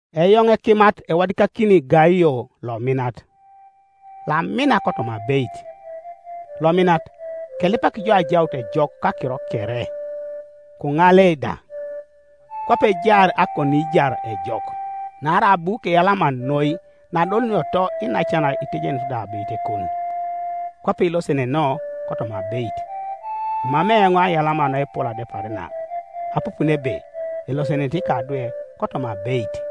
Eoŋ ekimat ewadikakini Gaio lominat, loamina kotoma abeit. Lominat, kelipak jo ajaut ejok kakiro kere, koŋale da, kwape ejaar akoniijar ejok. Naarai abu keyalama noi naadolunioto iinacan kitejenut da abeitekon; kwape ilosenenoo kotoma abeit. Emamei eoŋ aiyalama naepol adepar na, apupun ebe elosenenete ikadwe kotoma abeit.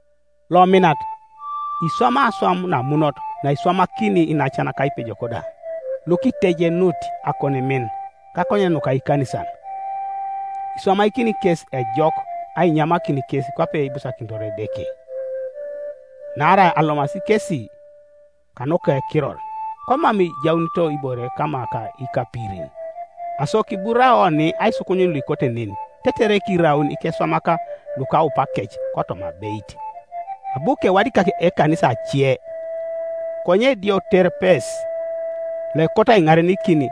Lominat, iswamai aswam namunot naiswamakini iinacan ka ipejok da, lukitejenut akonimin kakonyen nuka ikanisan. Iswamakini kes ejok ainyamakin kes kwape ibusakinitor Edeke. Naarai alomasi kesi kanuka Ekiror, komam ijaunito ibore kama ka ikapirin. Aso kiburao oni aisukunyun luikote nen, tetere kiraun ikeswamak lukaupakec kotoma abeit. Abu kewadikak ekanisa ece; konye Dioterepes loekot aiŋarenikin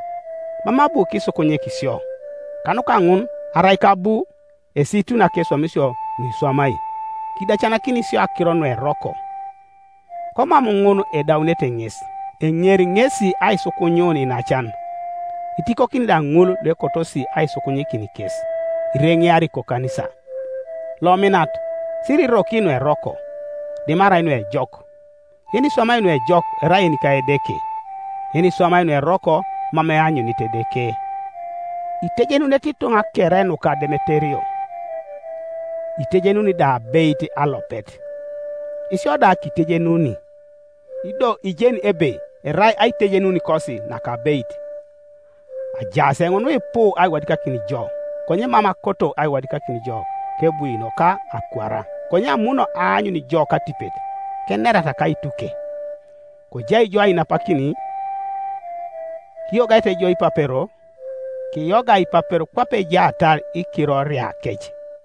mam abu kisukunyik sio. Kanuka ŋun, arai kabu, esiituni akeswamisio nuiswamai; kidacanakini sio akiro nueroko, Komam ŋun edaunete ŋes, eŋeri ŋesi aisukunyun iinacan, itikokini da ŋul luekotosi aisukunyikin kes, ireŋeari kokanisa. Lominat, siriroki nueroko, dimarai nuejok, Yeniswamai nuejok erai yenika Edeke; yeniswamai nueroko mam eanyunit Edeke. Itejenunete ituŋa kere nuka Demeterio, itejenuni da abeit alopet; isio da kitejenuni, ido ijeni ebe erai aitejenunikosi nakabeit. Ajaas eoŋ nuipu aiwadikakin jo, konye mam akoto aiwadikakin jo kebwino ka akwara; konye amuno aanyun jo katipet, kenerata kaituke. Kojai ijo ainapakin. Kiyogaete jo ipapero. Kiyoga ipapero kwape ejaatar ikiroriakec.